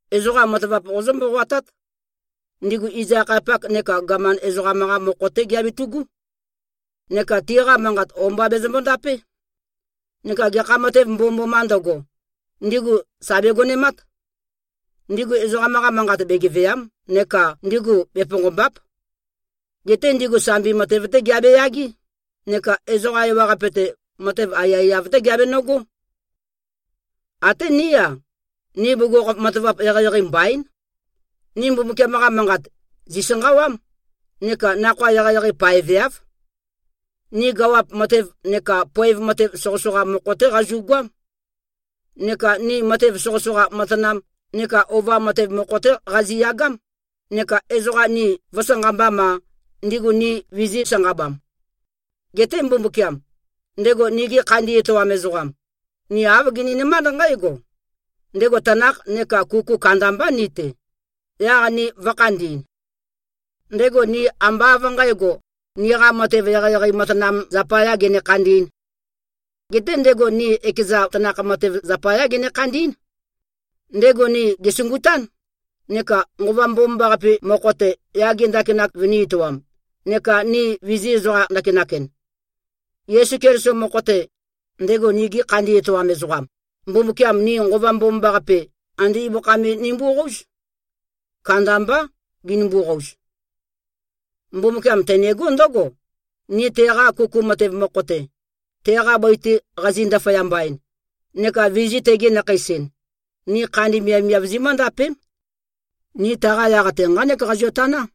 Ezoqa matavap qozǿ-mboqoatát: Ndigu iz-akhayapak neka gaman ezoqam-qa mokho-té giabetu꞉gú. Neka tiqa manqat o-mba bezømbo-ndapé. Neka gekha matev mbomømbomā ndøgo, ndigu sà begonemát. Ndigu ezoqam-qa manqa begevèa᷄m neka ndigu beponqòmba᷄p. Geté ndigu sambi matev-té giabe-yagé, neka ezoqa ewaqape-te, matev aiyaiyav-té giabenøgó. Até ní-a, ni bugukhokhof matavap eqeieqei mbaín. Ni Mbumbukiam-qa Manqat, zìsanqawám, neka nakhoa eqeieqei paveáv. Ni gawap matev neka poev matev soqøsoqa mokho-té qazu꞉goám. Neka ni matev soqøsoqa matanam neka ova matev mokho-té qaziyagám, neka ezoqa ni vø̄sanqambam-a, ni ndigu vizī-sanqabam. Geté Mbumbukiam, ndego nigi khandi etoam ezoqam, ni āv gininømánd nqǽgo: Ndego tanakh neka kuku kandambá ni-te, yaq ni vø̄khandi꞉n. Ndego ni ambá av nqǣgo, niqa matev eqeieqei matanam zapayā gene-khandī꞉n. Geté ndego ni ekeza tanakh matev zapayá gene-khandí꞉n. Ndego ni gèsungután, neka Nqova Mbomambaqape mokho-te, yage ndakinak vønī-etoam neka ni vizī-ezoqam-ndakinak-en. Yesu Keliso mokho-te, ndego nigi khandi etoam ezoqam, Mbumbukiam ni Nqova Mbomambaqape, andé ibøkha me nimboqóuz. Kandambá, ginimbo-qouz. Mbumbukiam tenegó ndǿgo: Ni teqa kuku matev mokho-te, teqa bøi-te qazi-ndaføyamba-en, neka vizī-tegi-nakheis-en, ni khandi miavmiav zimǿndapém. Ni taqa yaq-te nqánek nqazio-taná.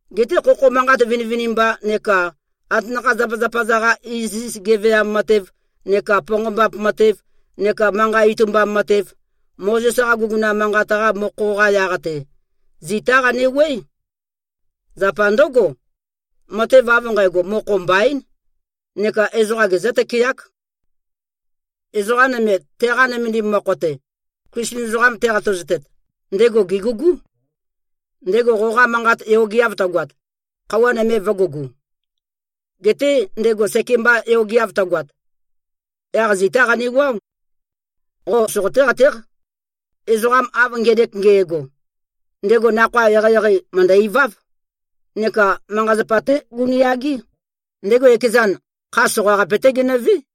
Geté khokho manqat vinivinimba neka atanakha-zapazapa-za-qa iziz geveam matev neka ponqombap matev neka manqa itumbam matev, Mozes-qa guguna manqat-qa mokho-qa yaq-te, zitá qanewuøé. Zapa ndǿgo, matev av nqægo, mokho mbaín neka ezoqa gezǿ-tøkeák. Ezoqa nøme, teqa nømendim mokho-te, Klisten ezoqam teqatazotet, ndego gègugú. Ndego qoqa manqat yogeav tøgoat, khøuwa nøme vø̄gugu. Geté ndego sekemba yogeav tøgoat, yaq zitá qanewuáo. Qo soqoté-qatéq, ezoqa av ngenek nge꞉go, ndego nakhoa eqeieqei mø̀ndø-iváv neka manqa-zapa-té gunu꞉yagé. Ndego ekezan, kha soqaqape-té genøvé.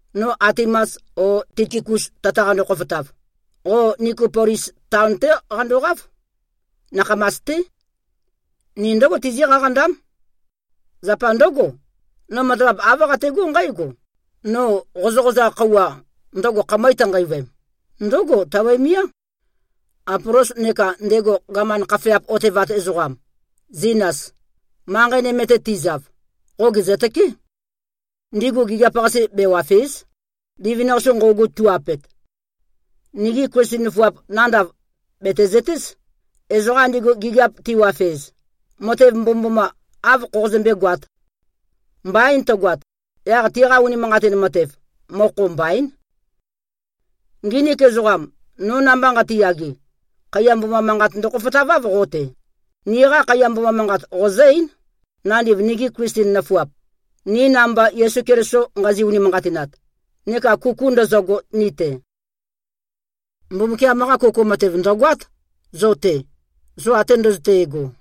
No Atimas o Tikikus tøtaqando-khofotav, qo Nikopolis taon-té qandoqáv. Nakhamas-té. Ni ndǿgo tizí-qaqandám. Zapa ndǿgo, no matavap āv qategó nqǽgo: No qozøqozaq khøuwa, ndøgo khamøe tønqeivøem, ndǿgo tabøemiá. Apolos neka ndego gaman khafeap otevat ezoqam, Zinas, manqei nøme-te tizav, qo gèzøtøké. Ndigu gigiap-qase bewàfe᷄z, livin-qase nqøugu tu꞉-apet. Nigi Klisten nøfuap nandav, bètezøtéz, ezoqa ndigu gigiap tiwafez, matev mbomømboma āv khoqozømbé-goāt. Mbain tøgoat, yaq tiqa unimanqatin matev, mokho mbaín. Nginik ezoqam, no namba nqatiyage, khaiya mboma manqat ndøkhofotaváv qo-te. Niqa khaiya mboma manqat qozǿ-eín, nandiv nigi Klisten nøfuap, ni namba Yesu Keliso nqazi-unimanqatinat neka kuku ndøzøgo ni-te. Mbumbukiam-qa kuku matev, ndø̀goát, zo-te, zo ate ndøzøte꞉go.